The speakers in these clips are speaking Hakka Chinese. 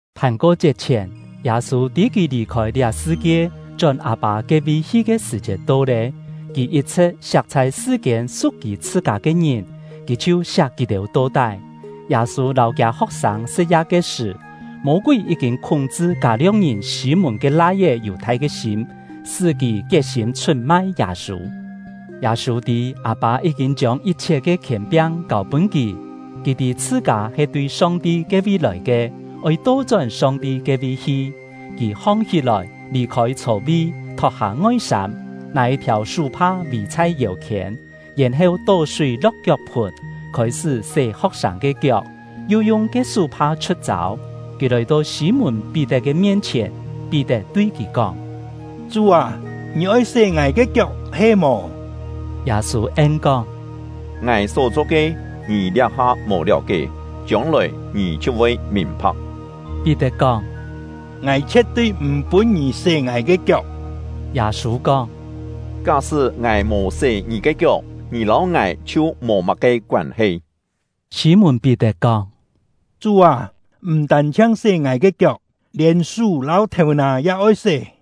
Phàn-ko-chiet chhièn, Yâ-sû tî kì lì-khôi liá sṳ-kie chón Â-pâ ke-vi hi ke sṳ̀-chiet to lé. Kì yit-chhṳ̍t siak chhai sṳ-kiên su̍k kì chhṳ-kâ ke ngìn, kì chhiu siak kì-têu to-tái. Yâ-sû lâu kiâ ho̍k-sâng sṳ̍t-ya ke sṳ̀, Mô-kúi yí-kîn khúng-chṳ Kâ-lio̍k-ngìn Sî-mùn ke lai-é Yù-thai ke sîm, sṳ́ kì kiet-sîm chhut-mai Yâ-sû. Yâ-sû tî Â-pâ yí-kîn chiông yit-chhiet ke khièn-piang kâu-pûn kì; kì tî chhṳ-kâ he tui Song-ti ke-vi lòi ke, oi to-chón Song-ti ke-vi hi. Kì hong-hí-lòi, lì-khôi chho-vi, thot-hâ ngoi-sâm, nâ yit-thiàu sú-pha vì chhai yêu-khiên, yèn-heu tó súi lo̍k kiok-phùn, khôi-sṳ́ sé ho̍k-sâng ke kiok, yu yung ke sú-pha chhu̍t-châu. Kì lòi-to Sî-mùn-Pí-tet ke mien-chhièn, Pí-tet tui kì kóng: “Chú â, ngì oi sé ngài ke kiok he-mò?” Yâ-sû en-kóng: “Ngài só-cho ke, ngì liá-ha mò liáu-kié, chiông-lòi ngì chhiu voi mìn-pha̍k.” Pí-tet kóng: “Ngài chhie̍t-tui m̀ pûn ngì sé ngài ke kiok!” Yâ-sû kóng: “Ká-sṳ́ ngài mò sé ngì ke kiok, ngì lâu ngài chhiu mò má-ke koân-he.” Sî-mùn-Pí-tet kóng: “Chú â, m̀ tân-chhiang ngài ke kiok, lièn sú lâu thèu-nà ya oi sé!”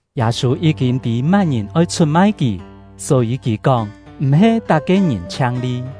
(Yâ-sû yí-kîn tî má-ngìn oi chhut-mai kì, só-yî kì kóng: “M̀-he tak-ke ngìn chhiang-li.”)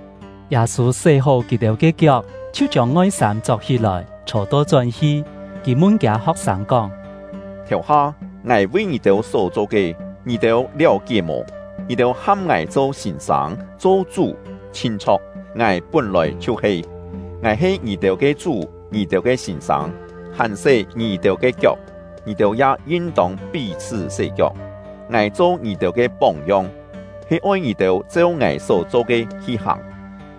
Yâ-sû sé-hó kì-têu ke kiok, chhiu chiông ngoi-sâm chok-hí-lòi, chhô to-chón hi. Kì mun kiâ ho̍k-sâng kóng: “Thèu-ha, ngài vi ngì-têu só cho ke, ngì-têu liáu-kié mò? Ngì-têu ham ngài cho sîn-sâng, cho Chú, chhin chho̍k, ngài pún-lòi chhiu-he. Ngài he ngì-têu ke Chú, ngì-têu ke sîn-sâng, hàn sé ngì-têu ke kiok, ngì-têu ya yin-tông pí-chhṳ́ sé kiok. Ngài cho ngì-têu ke póng-yong, he oi ngì-têu cheu ngài só-cho ke hi hàng.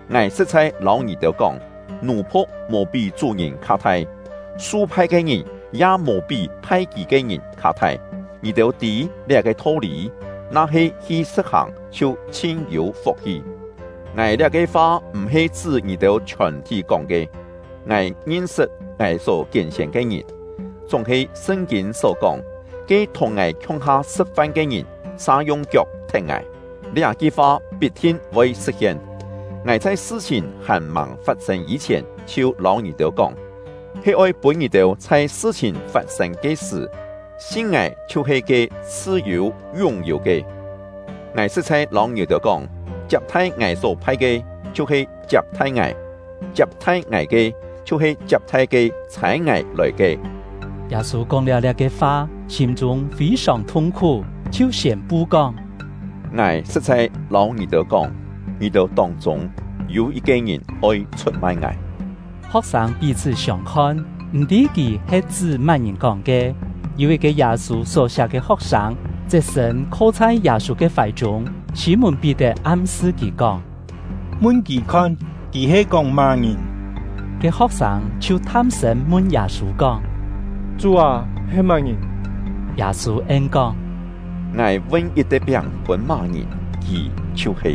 Ngài sṳ̍t-chhai lâu ngì-têu kóng, nù-phu̍k mò pí chú-ngìn kha thai, su-phai ke ngìn ya mò pí phai kì ke ngìn kha thai. Ngì-têu tî liá-ke tho-lî, na-he hi sṳ̍t-hàng chhiu chhin-yû fuk-hi! “Ngài liá-ke fa m̀-he chṳ́ ngì-têu chhiòn-thí kóng ke; ngài ngin-sṳt ngài só kién-sién ke ngìn. Chúng-he Sṳn-kîn só kóng ‘Ke thùng ngài khiung-ha sṳ̍t-fan ke ngìn, sa yung kiok thet ngài’, liá-ki fa pit-thin voi sṳ̍t-hien. Ngài chhai sṳ-chhìn hàn-màng fat-sên yî-chhièn chhiu lâu ngì-têu kóng, he oi pûn ngì-têu chhai sṳ-chhìn fat-sên ke sṳ̀, sin ngài chhiu-he ke ‘Chhṳ-yû Yún-yû’ ke. Ngài sṳ̍t-chhai lâu ngì-têu kóng, chiap-thai ngài só phai ke, chhiu-he chiap-thai ngài; chiap-thai ngài ke, chhiu-he chiap-thai ke ‘Chhâi ngài lòi ke’.” Yâ-sû kóng-liáu liá-ke fa, sîm-chûng fî-sòng thung-khú, chhiu siên-pu kóng: “Ngài sṳ̍t-chhai lâu ngì-têu kóng, ngì-têu tông-chûng yû yit-ke ngìn oi chhut-mai ngài.” Ho̍k-sâng pí-chhṳ́ siông-khon, m̀-tî kì he chṳ́ má-ngìn kóng ke. Yû yit-ke Yâ-sû só-siak ke ho̍k-sâng, chet-sṳ̂n kho chhai Yâ-sû ke fài-chûng. Sî-mùn-Pí-tet am-sṳ kì kóng: “Mun kì khon, kì he kóng má-ngìn.” Ke ho̍k-sâng chhiu tham-sṳ̂n mun Yâ-sû kóng: “Chú â, he má-ngìn?” Yâ-sû en-kóng: “Ngài vun yit-te piáng-è pûn má-ngìn, kì chhiu-he.”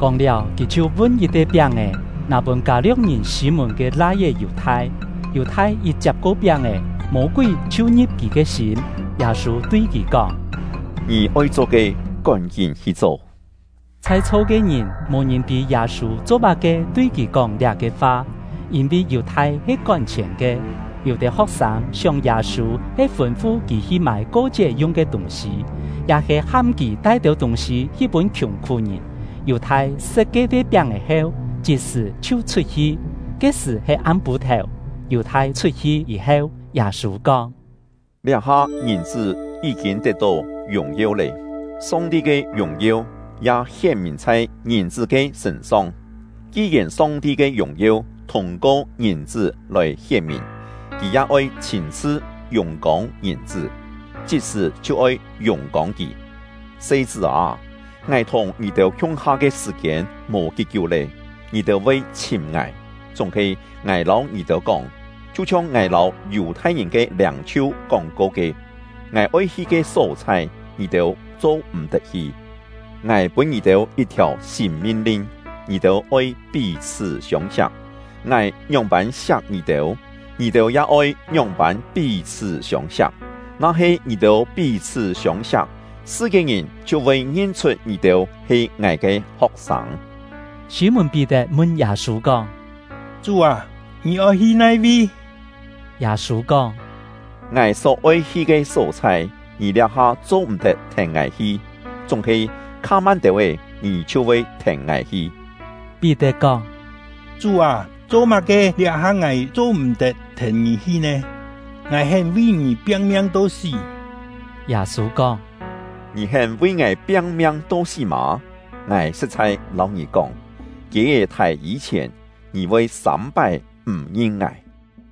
Kóng-liáu, kì chhiu vun yit-te piáng-è, nâ pûn Kâ-lio̍k-ngìn Sî-mùn ke lai-é Yù-thai. Yù-thai yit chiap-ko piáng-è, Mô-kúi chhiu ngi̍p kì ke sîm. Yâ-sû tui kì kóng: “Ngì oi cho ke, kón-kín hi cho!” Chhai-chho ke ngìn, mò ngìn tî Yâ-sû cho-má-ke tui kì kóng liá-ke fa. Yîn-vi Yù-thai he kón-chhièn ke, yû-têu ho̍k-sâng sióng Yâ-sû he fûn-fu kì hi mâi ko-chiet yung ke tûng-sî, ya-he ham kì tai têu tûng-sî hi pûn khiùng-khú-ngìn. Yù-thai sṳ̍t ke-te piáng-è heu, chit-sṳ̀ chhiu chhut-hi. Ke-sṳ̀ he am-pû-thèu. Yù-thai chhut-hi yî-heu, Yâ-sû kóng: “Liá-ha Ngìn-chṳ́ yí-kîn tet-tó yùng-yeu lé; Song-ti ke yùng-yeu ya hién-mìn chhai Ngìn-chṳ́ ke sṳ̂n-song. Ki-yèn Song-ti ke yùng-yeu thûng-ko Ngìn-chṳ́ lòi hién-mìn, Kì ya oi chhîn-chhṳ yùng-kông Ngìn-chṳ́, chit-sṳ̀ chhiu oi yùng-kông kì. Se-chṳ́ â, ngài thùng ngì-têu khiung-ha ke sṳ̀-kiên mò kí-kiú lé. Ngì-têu voi chhìm ngài, chúng-he ngài lâu ngì-têu kóng, chhiu-chhiong ngài lâu Yù-thai-ngìn ke liâng-chhiu kóng-ko ke: ‘Ngài oi hi ke só-chhai, ngì-têu cho-m̀-tet hi.’ Ngài pûn ngì-têu yit-thiàu sîn min-lin: Ngì-têu oi pí-chhṳ́ siông-siak; ngài ngióng-pân siak ngì-têu, ngì-têu ya oi ngióng-pân pí-chhṳ́ siông-siak. Na-he ngì-têu pí-chhṳ́ siông-siak, sṳ-kiên-ngìn chhiu voi ngin-chhut ngì-têu he ngài ke ho̍k-sâng.” Sî-mùn-Pí-tet mun Yâ-sû kóng: “Chú â, ngì oi hi nai-vi?” Yâ-sû kóng: “Ngài só-oi hi ke só-chhai, ngì liá-ha cho-m̀-tet thèn ngài hi, chúng-he kha-man têu-é ngì chhiu voi thèn ngài hi.” Pí-tet kóng: “Chú â, cho-má-ke liá-ha ngài cho-m̀-tet thèn ngì hi nè? Ngài hén vi ngì piang-miang to sí!” Yâ-sû kóng: “Ngì hén vi ngài piang-miang to sí mâ? Ngài sṳ̍t-chhai lâu ngì kóng, kiê-é thài yî-chhièn, ngì voi sâm-pái m̀ ngin ngài.”